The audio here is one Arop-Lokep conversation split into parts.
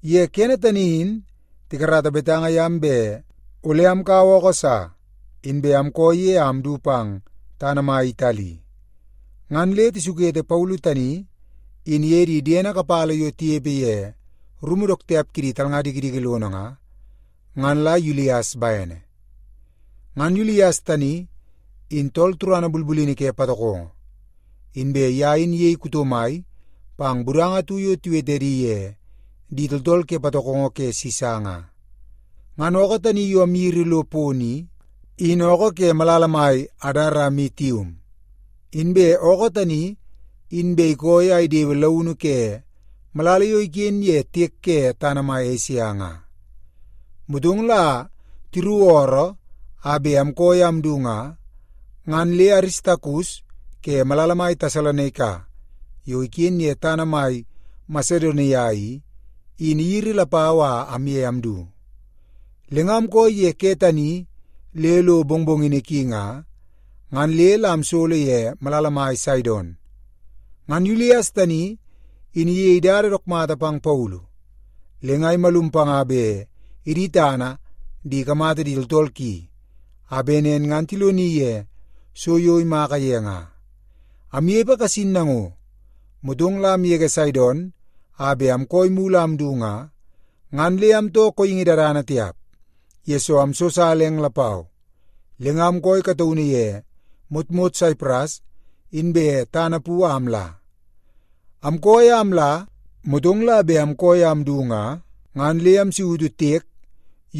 Ye kene tani in tikarata betanga yam bet ole amkaua ookoo sa, inbe amkooi ye a amdu pang tana mai Itali. Ngan le tisukete Paulu tani in iye di diene kapala yo tinepe ye rumu dook tiap kidi talnga dikidiki lono nga, ngan la Yulies bene. Ngan Yulies tani in tool turana bulbulini ke patokongo, inbe ye in iyei kuto mai pang budanga atu yo tiwete edi ye Di Tooltool Ke Patokongo Ke Sisa nga. Ngan ookoo tani yo amyiri lo pono i, in ookoo ke malala mai Adaramitium. Inbe ookoo tani in bet ikooi a idewe launu ke malala yo iken ye tiek ke tana mai Esia nga. Motong la tiruku ooroo a bet amkooi a amdu nga, ngan le Aristakus ke malala mai Tesalonaika yo iken ye tana mai Masedonia i, in iyiri lapau a amye amdu. Le nga amkooi ye ke tani le lo mongmongini ki nga, ngan le la amsolo ye malala mai Saidon. Ngan Yulies tani in iyei dada dook mata pang Paulu, le nga imalum panga bet idi tana di ikamata di tooltool ki, a bet nen ngan tiloni ye so yo imaka ye nga. Amnepe kasin nango, motong la amgege Saidon a bet amkooi mulu a amdu nga, ngan le amtoo kooingi dadana tiap, yesoo amsosala eng lapau. Le nga amkooi kataunu ye motmot Saipras, inbe tana pu a amla. Amkooi a amla, motong la bet amkooi a amdu nga, ngan le amsautu tiek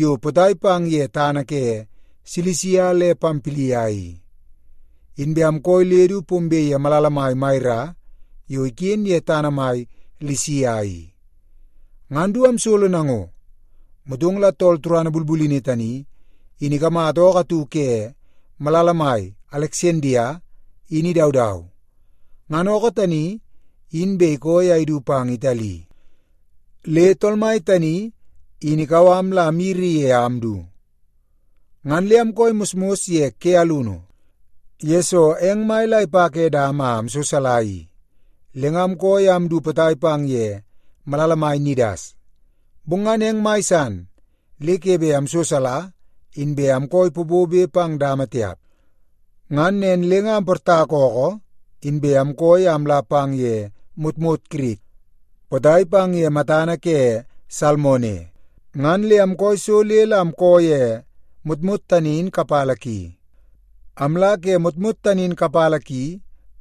yo potai pang ye tana ke Silisia le Pampilia i, inbe amkooi le du pombe ye malala mai Maira yo iken ye tana mai Lisia i. Ngan du amsolo nango, motong la tool turana bulbulini tani in ikamata ookoo atu ke malala mai Aleksandia in idaudau. Ngan ookoo tani in bet ikooi a idu pang Itali, le tool mai tani in ikau am la amyiri ye a amdu. Ngan le amkooi mosmos ye ke alunu, yesoo eng mai la ipa ke dama a amsosali i. Le nga amkooi a amdu potai ye malala mai Nidas, bong ngan eng mai san le ke bet amsosali, inbe amkooi popobe pang dama tiap. Ngan nen le nga amportaka ookoo, inbe amkooi a amla pang ye motmot Kirit potai pang ye matana ke Salmone. Ngan le amkooi so le la amkoo ye motmot tani in kapala ki. Amla ke motmot tani in kapala ki,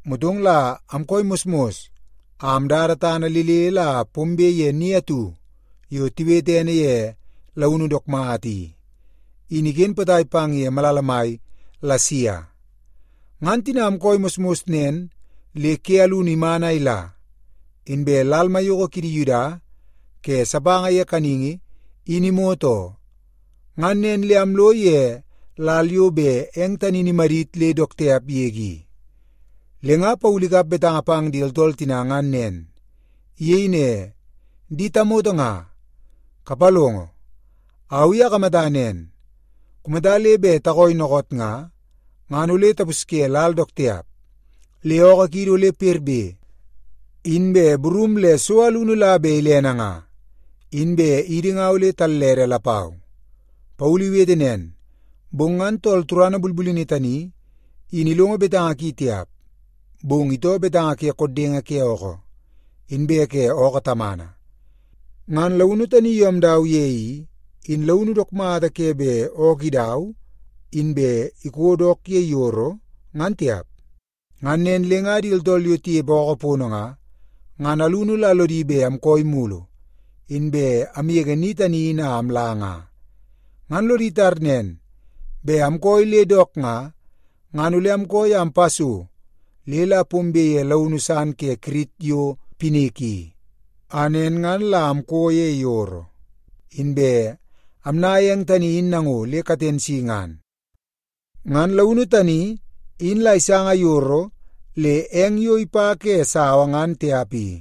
motong la amkooi mosmos a amdada tana le le la pombe ye ni atu yo tiwete ene ye Launu Dook Mata i, in iken potai pang ye malala mai Lasia. Ngan tina amkooi mosmos nen le ke alunu iman a ila, inbe lal maiyoko kidi Yuda ke sapanga ye kaningi in imot oo. Ngan nen le amlo ye lal yo bet eng tani in imadit le dook tiap yege i, le nga Paulu ikap betanga pang di tooltool tina ngan nen. Iyei ne, “Di tamoto nga, kapalongo! Au i akamata nen, kumata le bet takooi dookoot nga, ngan ole tapusye lal dook tiap, le ookoo kiidi ole perbe, inbe burum le so alunu la bet ilene nga. Inbe idi nga ole tallede lapau.” Paulu iwete nen, bong ngan tool turana bulbulini tani in ilongo betanga ki tiap. Bong itoo betanga ke koddenge ke ookoo, inbe ke ookoo tamana. Ngan launu tani yo amdau ye i, in launu dook mata ke bet ookoo idau, inbe iko dook ye yoro, ngan tiap. Ngan nen le nga di tooltool yo tinepe ookoo pono nga, ngan alunu la lodi bet amkooi mulu, inbe amgege ni tani in a amla nga. Ngan lodi tar nen, bet amkooi le dook nga, ngan ole amkooi a ampa so le la pombe ye launu san ke Kirit yo Pinik i, a nen ngan la amko ye yoro, inbe amnaia eng tani in nango le katen si ngan. Ngan launu tani in la isanga yoro le eng yo ipa ke sawa ngan tiap i.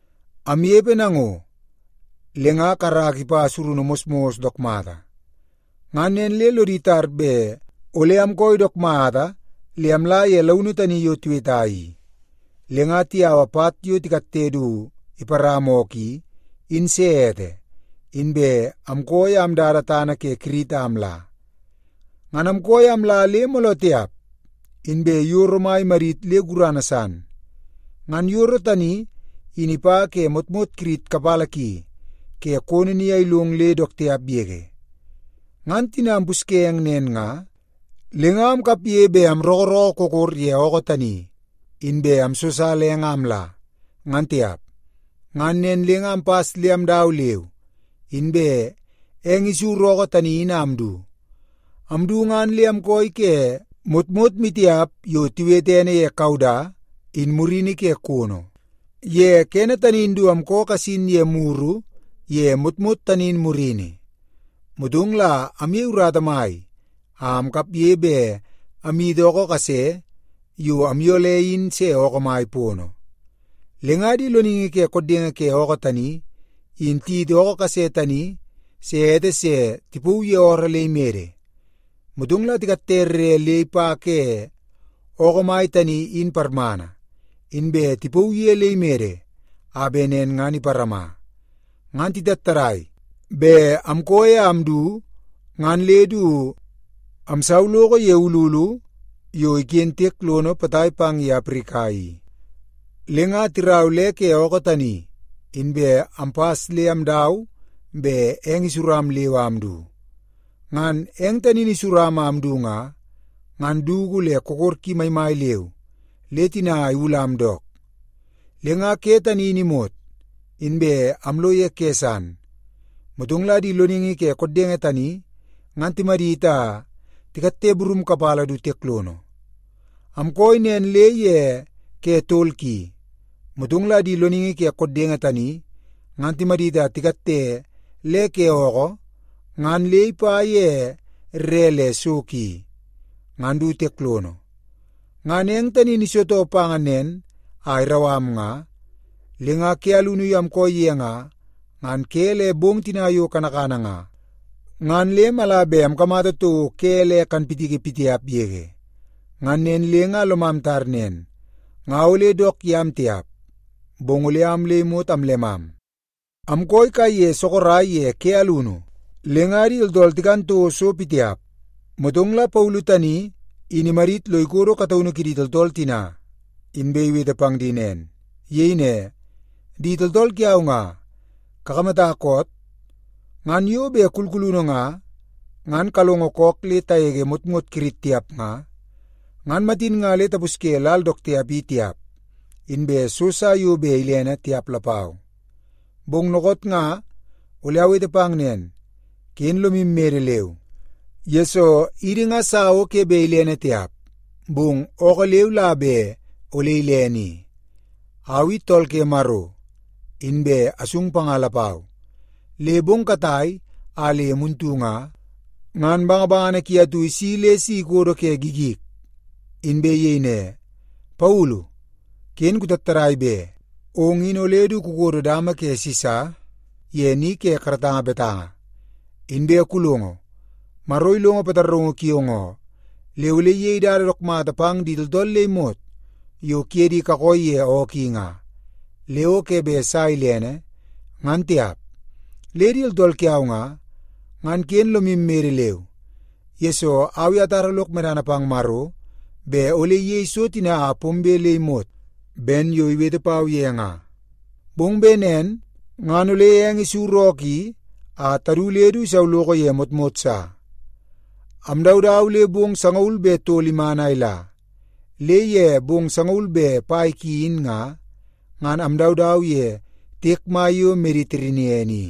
Amnepe nango, le nga karaka ipa surunu mosmos dook mata. Ngan nen le lodi tar bet ole amkooi dook mata le amla ye launu tani yo tiweta i. Le nga tiyaua pat yo tikatte du iparama ookoo i, in se ete, inbe amkooi a amdada tana ke Kirit a amla. Ngan amkooi a amla le mooloo tiap, inbe yoro mai imadit le gurana san. Ngan yoro tani in ipa ke motmot Kirit kapala ki ke kono ni a ilong le dook tiap yege. Ngan tina ampusye eng nen nga, le nga amkapge bet amrookoo kokor ye ookoo tani, inbe amsosala eng a amla, ngan tiap. Ngan nen le nga ampas le amdau leu, inbe eng isuru ookoo tani in a amdu. Amdu ngan le amkooi ke motmot maitiap yo tiwete ene ye Kauda in murini ke kono. Ye kene tani in du amko kasin ye muru ye motmot tani in murini, motong la amyei urata mai a amkapge bet amyiti ookoo kase yo amyole in se ookoo mai pono. Le nga di loningi ke koddenge ke ookoo tani in tiyiti ookoo kase tani se ete se tipauu ye ooroo le imede, motong la tikatte rre le ipa ke ookoo mai tani in parmana, inbe tipauu ye le imede a bet nen ngan iparama. Ngan titattadai bet amkooi a amdu ngan le du amsauloko ye ululu yo iken tiek lono potai pang ye Aprika i, le nga tirau le ke ookoo tani, inbe ampas le amdau bet eng isuram leu a amdu. Ngan eng tani in isuram a amdu nga, ngan dugu le kokor ki maimai leu le tina iwulam dook. Le nga ke tani in imot, inbe amlo ye ke san, motong la di loningi ke koddenge tani ngan timadit a tikatte burum kapala du tiek lono. Amkooi nen le ye ke tol ki, motong la di loningi ke koddenge tani ngan timadit a tikatte le ke ookoo ngan le ipa ye rre le so ki, ngan du tiek lono. Ngan eng tani in isitoo pa nen a irau am nga, le nga ke alunu yo amkooi ye nga, ngan ke le bong tina yo kanakana nga, ngan le mala bet amkamata toko ke le kanpitiki pitiap yege. Ngan nen le nga lomam tar nen, nga ole dook yam tiap, bong ole am le imot amllemam. Amkooi sorok kaiye ye ke alunu, le nga di tooltool tikan toko so pitiap. Motong la Paulu tani in imadit lo ikodo kataunu kidi tooltool tina, inbe iwete pang di nen. Iyei ne, “Di tooltool kiau nga, kakamata koot? Ngan yo bet kulkulunu nga, ngan kalongo kook le tagege motmot Kirit tiap nga, ngan matin nga le tapusye lal dook tiap i tiap, inbe so sa bet ilene tiap lapau. Bong dookoot nga ole awete pang nen, ken lomu mede leu, yesoo idi nga sa o ke bet ilene tiap, bong ookoo leu la bet ole ilene i. Au i tool ke Maro, inbe asung panga lapau. Le bong katai a le muntu nga, ngan bangabangana ki atu isi le si ikodo ke gigik, inbe iyei ne, ‘Paulu, ken kutattadai be! Ong in ole du kukodo dama ke Sisa ye ni ke karatanga betanga. Inbe kulongo, Maro ilongo pataraungu kiong oo, le ole iyei dada dook mata pang di tooltool le imot yo kuye di kakooi ye ookoo i nga, le o ke bet sa ilene, ngan tiap.’ Le di tooltool kiau nga, ngan ken lomu mede leu, yesoo au i atara lok medana pang Maro bet ole iyei so tina a pombe le imot ben yo iwete pau ye nga. Bong bet nen ngan ole eng isuru ookoo i a tadu le du isauloko ye motmot sa.” Amdaudau le bong sangaul be tol iman a ila, le ye bong sangaul be pai ki in nga, ngan amdaudau ye tiek mai yo Mediterenian i.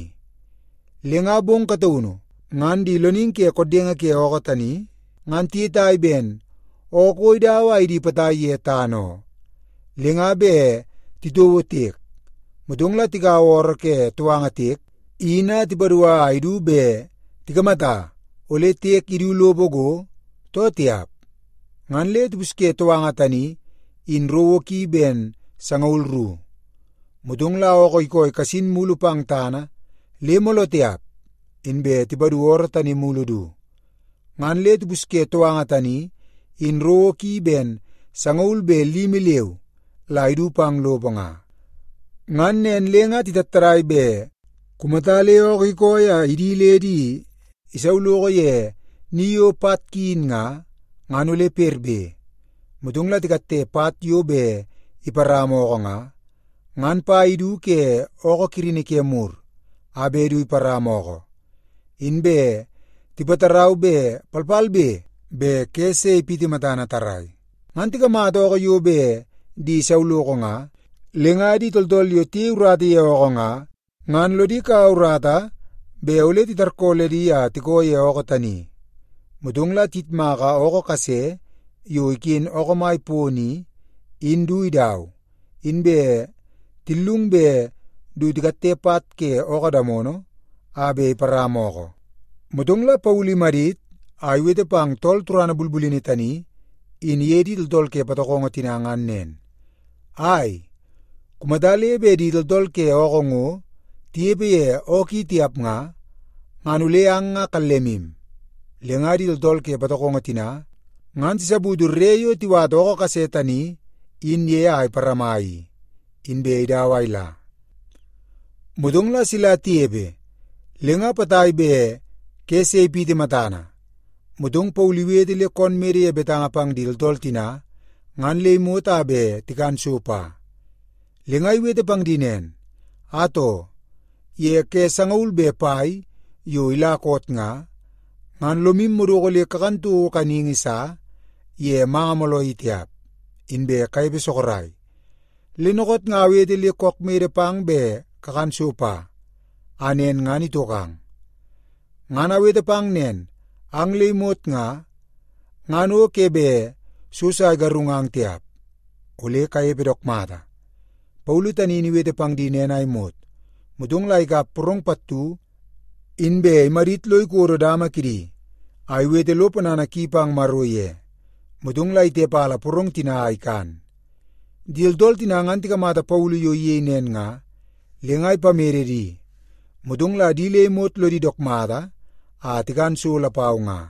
Le nga bong kataunu ngan di loningi ke koddenge ke ookoo tani ngan tiyetai ben ookoo o idau a idi potai ye tana oo. Le nga bet titouo tiek, motong la tikaua ooroo ke touanga tiek in a tipadua a idu bet tikamata ole tiek idu lopo go, too tiap. Ngan le tipusye touanga tani in rowo ki ben sangaul ru. Motong la ookoo ikooi kasin mulu pang tana le mooloo tiap, inbe tipadu ooroo tani mulu du. Ngan le tipusye touanga tani in rowo ki ben sangaul be limi leu la idu pang lopo nga. Ngan nen le nga titattadai bet kumata le ookoo ikooi a idi le di isauloko ye ni yo pat ki in nga, ngan ole perbe. Motong la tikatte pat yo bet iparama ookoo nga, ngan pai idu ke ookoo kirini ke mur a bet du iparama ookoo, inbe tipatarau bet palpalbe be ke se ipiti matana tarrai. Ngan tikamata ookoo yo bet di isauloko nga, le nga di tooltool yo tiyei urata ye ookoo nga, ngan lodi kaua urata bet ole titarkooledi a tikoo ye ookoo tani. Motong la tiyitmaka ookoo kase yo iken ookoo mai pono i, in du idau, inbe tillung bet du tikatte pat ke ookoo damono a bet iparama ookoo. Motong la Paulu imadit a iwete pang tool turana bulbulini tani in iye di tooltool ke patokongo tina ngan nen, “Ai, kumata le bet di tooltool ke ookoo ngo tinepe ye ookoo i tiap nga, ngan ole ang nga kallemu.” Le nga di tooltool ke patokongo tina ngan tisaputu rre yo tiwata ookoo kase tani in ye a iparama i, inbe idau a ila. Motong la sila tinepe le nga potai bet ke se ipiti matana, motong Paulu iwete le koon mede ye betanga pang di tooltool tina ngan le imot a bet tikan so pa. Le nga iwete pang di nen, “Atoo, ye ke sangaul be pai yo ila koot nga, ngan lomu madoko le kakan toko kaningi sa ye manga mooloo i tiap, inbe kanepe sorok. Le dookoot nga awete le kook mede pang bet kakan so pa, a nen ngan itokang. Ngan awete pang nen, ang le imot nga, ngan o ke bet so sa igarungang tiap. Ole kanepe dook mata.” Paulu tani in iwete pang di nen a imot, motong la ikap porong pattu, inbe imadit lo ikodo dama kidi, a iwete lo ponana ki pang Maro ye, motong la itepala porong tina a ikan. Di tooltool tina ngan tikamata Paulu yo iyei nen nga, le nga ipamede di, motong la di le imot lodi dook mata a tikan so lapau nga.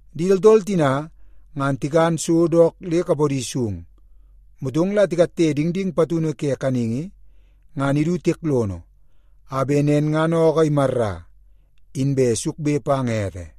Di tooltool tina ngan tikan so dook le kapodi sung, motong la tikatte dingding patunu ke kaningi, ngan idu tiek lono, a bet nen ngan ookoo imarra, inbe sukbe pang ete.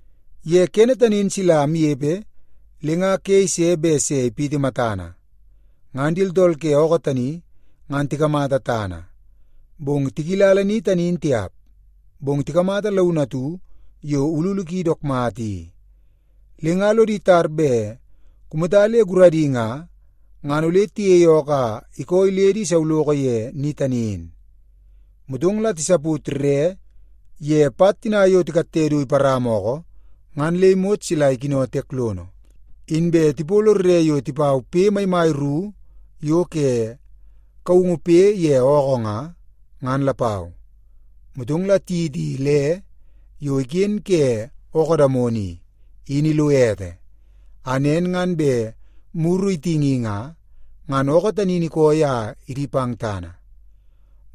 Ye kene tani in sila amnepe le nga ke ise bet se ipiti matana, ngan di tooltool ke ookoo tani ngan tikamata tana, bong tikilala ni tani in tiap. Bong tikamata launu atu yo ululu ki dook mata i. Le nga lodi tar bet kumata le guradi nga, ngan ole tiyeie ookoo a ikooi le di isauloko ye ni tani in. Motong la tisaput rre ye pat tina yo tikatte du iparama ookoo ngan le imot sila ikino tiek lono. Inbe tipolo rre yo tipau poi maimai ru yo ke kaungu poi ye ookoo nga, ngan lapau. Motong la tiyiti le yo iken ke ookoo damono i, in ilo ete, a nen ngan bet muru itingi nga, ngan ookoo tani in ikooi a idi pang tana.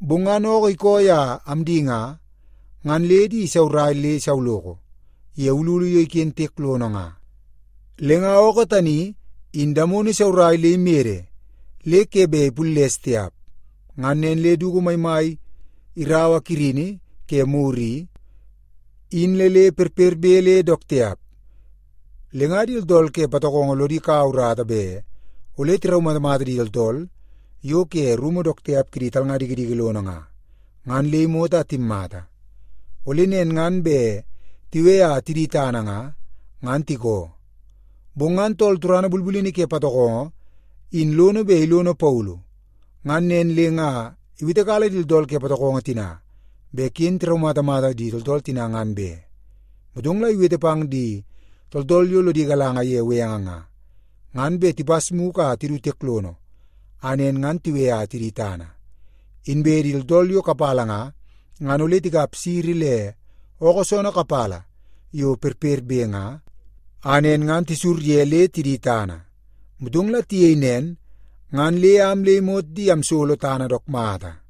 Bong ngan ookoo ikooi a amdi nga, ngan le di isaurai le isauloko ye ululu yo iken tiek lono nga. Le nga ookoo tani in damono isaurai le imede le ke bet ipulles tiap. Ngan nen le dugu maimai iraua kirini ke mur i, in le le perperbe le dook tiap. Le nga di tooltool ke patokongo lodi kaua urata bet ole tiraumatamata di tooltool yo ke rumu dook tiap kidi talnga dikidiki lono nga, ngan le imot a timmata. Ole nen ngan bet tiwe a tidi tana nga, ngan tikoo. Bong ngan tool turana bulbulini ke patokongo in lono bet ilono Paulu. Ngan nen le nga iwetekala di tooltool ke patokongo tina bet ken tiraumatamata di tooltool tina ngan be. Motong la iwete pang di tooltool yo lodi galanga ye benge nga, ngan bet tipas mugu a tidu tiek lono, a nen ngan tiwe a tidi tana. Inbe di tooltool yo kapala nga, ngan ole tikap siri le ookoo soonoo kapala yo perperbe nga, a nen ngan tisur ye le tidi tana. Motong la tiyei nen, ngan le am le imot di amsolo tana dook mata.